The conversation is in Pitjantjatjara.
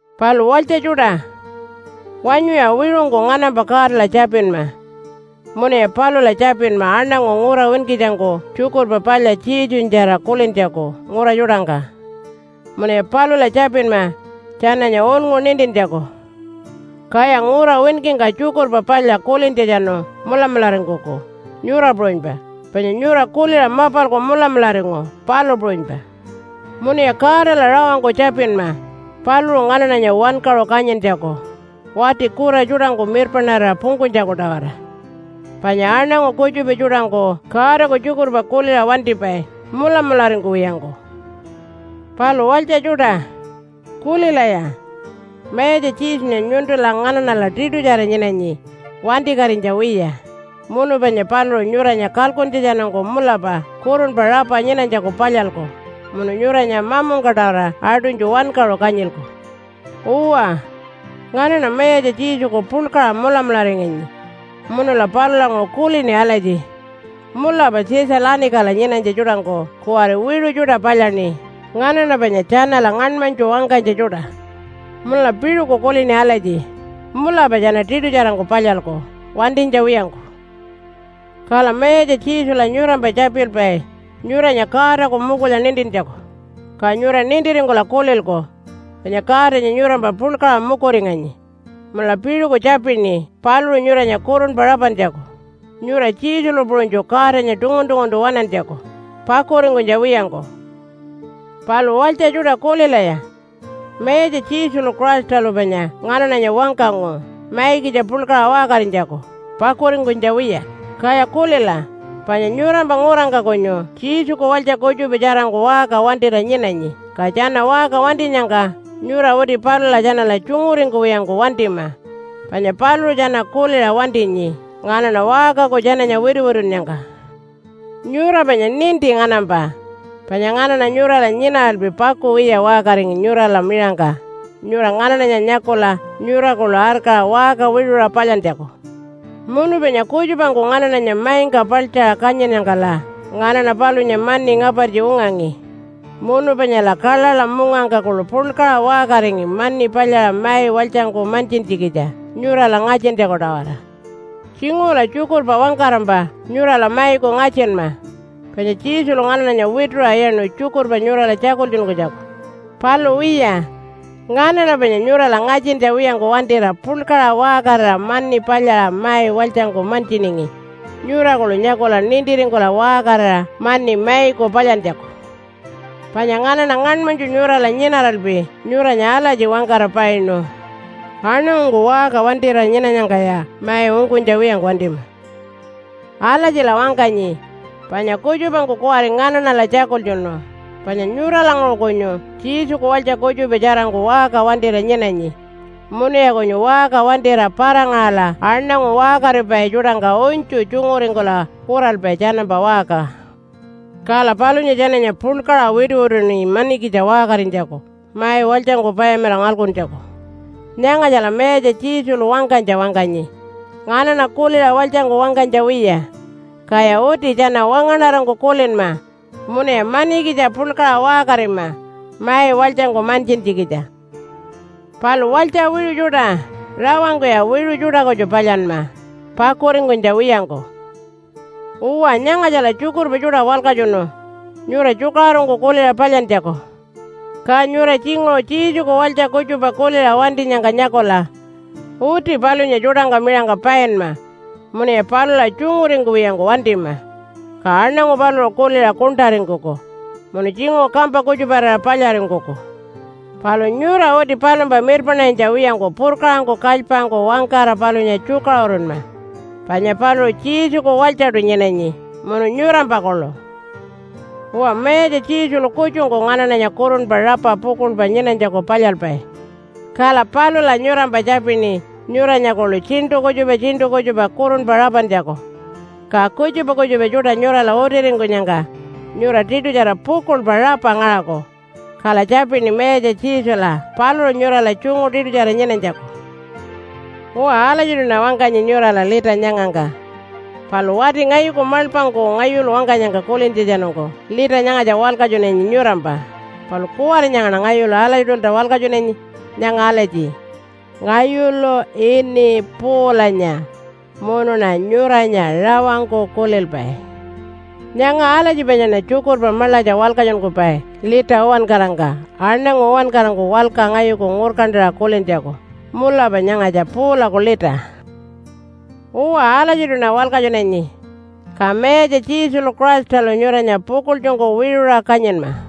Palu walytja tjuṯa, wanyuya wiṟungku nganampa Godala tjapinma. Munuya palula tjapinma aṉangu ngura winkitjangku Tjukurpa Palya Jesunyatjara kulintjaku ngura tjuṯangka. Munuya palula tjapinma tjananya unngu nintintjaku, kaya ngura winkingka tjukurpa palya kulintjatjanu mulamularingkuku, nyura puṟunypa, panya nyura kuliṟa mapalku mulamularingu, palu puṟunypa. Munuya Godala rawangku tjapinma paluṟu nganaṉanya wankaṟu kanyintjaku wati kura tjuṯangku mirpaṉarira pungkunytjaku-tawara, panya aṉangu kutjupa tjuṯangku Godaku tjukurpa kuliṟa wantipai mulamularingkuwiyangku. Palu walytja tjuṯa, kulilaya. Mayatja Jesunya nyuntula nganaṉala tiṯutjara nyinanyi wantikatinytja wiya, munu panya paluṟu nyuranya kalkuntjatjanungku mulapa kurunpa rapa nyinanytjaku palyalku munu nyuranya mamungka-tawara aṯunytju wankaṟu kanyilku. Uwa, nganaṉa Mayatja Jesuku puḻkaṟa mulamularinganyi munula palulanguṟu kulini alatji, “Mulapa Tjitja-lanikala nyinanytja tjuṯangku kuwari wiṟu tjuṯa palyaṉi nganaṉa panya tjanala ngaṉmanytju wangkanytja tjuṯa.” Munula piṟuku kulini alatji, “Mulapa tjana tiṯutjarangku palyalku wantinytja wiyangku.” Kala Mayatja Jesula nyurampa tjapilpai nyuranya Godaku mukulya nintintjaku, ka nyura nintiringkula kulilku panya Godanya nyurampa puḻkaṟa mukuringanyi. Munula piṟuku tjapini paluṟu nyuranya kurunpa rapantjaku, nyura Jesulu puṟunytju Godanya tungun-tunguntu waṉantjaku pakuringkunytja wiyangku. Palu walytja tjuṯa kulilaya, Mayatja Jesulu Christalu panya nganaṉanya wangkangu maikitja puḻkaṟa waṟkarinytjaku pakuringkunytja wiya. Kaya kulila, panya nyurampa ngurangka kunyu Jesuku walytja kutjupa tjarangku waṟka wantira nyinanyi. Ka tjana waṟka wantinyangka nyura uti palula tjanala tjunguringkuwiyangku wantima, panya paluṟu tjana kuliṟa wantinyi nganaṉa waṟkaku tjananya wituwitunnyangka. Nyura panya ninti nganampa, panya nganaṉa nyurala nyinaralpi pakuwiya waṟkaringi nyurala miṟangka nyura nganaṉanya nyakula nyura kuḻu arkaṟa waṟka wiṟuṟa palyantjaku. Munu panya kutjupangku nganaṉanya maingka paḻtjaṟa kanyinnyangkala nganaṉa palunya mani ngapartji ungangi. Munu panyala kaḻaḻa mungangka kuḻu puḻkaṟa waṟkaringi mani palyaṟa mai walytjangku mantjintjikitja nyurala ngatjintjaku-tawara. Tjinguṟula tjukurpa wangkarampa nyurala maiku ngatjinma, panya Jesulu nganaṉanya wituṟa iyaṉu tjukurpa nyurala tjakultjunkunytjaku. Palu wiya, nganaṉa panya nyurala ngatjintja wiyangku wantira puḻkaṟa waṟkarira mani palyaṟa mai walytjangku mantjiningi nyura kuḻu nyakula nintiringkula waṟkarira mani maiku palyantjaku. Panya nganaṉa ngaṉmanytju nyurala nyinaralpi nyuranya alatji wangkara painu, “Aṉangungku waṟka wantira nyinanyangkaya mai ungkunytja wiyangku wantima.” Alatjila wangkanyi panya kutjupangku kuwari nganaṉala tjakultjunu panya nyuralanguṟu kunyu Jesuku walytja kutjupa tjarangku waṟka wantira nyinanyi, munuya kunyu waṟka wantira para-ngaṟala aṉangu waṟkaripai tjuṯangka unytju tjunguringkula kuralpai tjanampa waṟka. Kala palunya tjananya puḻkaṟa wituwituṉi manikitja waṟkarinytjaku, mai walytjangku payamilaṟa ngalkuntjaku. Nyangatjala Mayatja Jesulu wangkanytja wangkanyi nganaṉa kuliṟa walytjangku wangkanytja wiya, kaya uti tjana wangaṉarangku kulinma munuya manikitja puḻkaṟa waṟkarima mai walytjangku mantjintjikitja. Palu walytja wiṟu tjuṯa, rawangkuya wiṟu tjuṯa kutju palyanma pakuringkunytja wiyangku. Uwa, nyangatjala tjukurpa tjuṯa walkatjunu nyura tjukaṟurungku kuliṟa palyantjaku. Ka nyura tjinguṟu Jesuku walytja kutjupa kuliṟa wantinyangka nyakula uti palunya tjuṯangka miṟangka painma munuya palula tjunguringkuwiyangku wantima. Ka aṉangu paluṟu kuliṟa kuṉṯaringkuku munu tjinguṟu kampa kutjuparira palyaringkuku. Palu nyura uti palumpa mirpaṉarinytja wiyangku purkaṟangku kalypangku wangkara palunya tjukaṟurunma, panya paluṟu Jesuku walytjaṯu nyinanyi munu nyurampa kuḻu. Uwa Mayatja Jesulu kutjungku nganaṉanya kurunpa rapa pukuḻpa nyinanytjaku palyalpai. Kala palula nyurampa tjapini nyuranya kuḻu tjiṉṯu kutjupa tjiṉṯu kutjupa kurunpa rapantjaku, ka kutjupa kutjupa tjuṯa nyurala utiringkunyangka nyura tiṯutjara pukuḻpa rapa ngaṟaku. Kala tjapini Mayatja Jesula paluṟu nyurala tjungu tiṯutjara nyinanytjaku. Uwa, alatjiṯuṉa wangkanyi nyurala lita nyangangka. Palu wati ngayuku maḻpangku ngayulu wangkanyangka kulintjatjanungku lita nyangatja walkatjunanyi nyurampa, palu kuwari nyangaṉa ngayulu alatjiṯulta walkatjunanyi nyanga alatji, “Ngayulu ini Paulanya munuṉa nyuranya rawangku kulilpai.” Nyanga alatji panyaṉa tjukurpa maḻatja walkatjunkupai lita uwankarangka aṉangu uwankarangku walka ngayuku ngurkantaṟa kulintjaku, “Mulapa nyangatja Paulaku lita.” Uwa, alatjiṯuṉa walkatjunanyi. Ka Mayatja Jesulu Christalu nyuranya pukuḻtjungku wiṟuṟa kanyinma.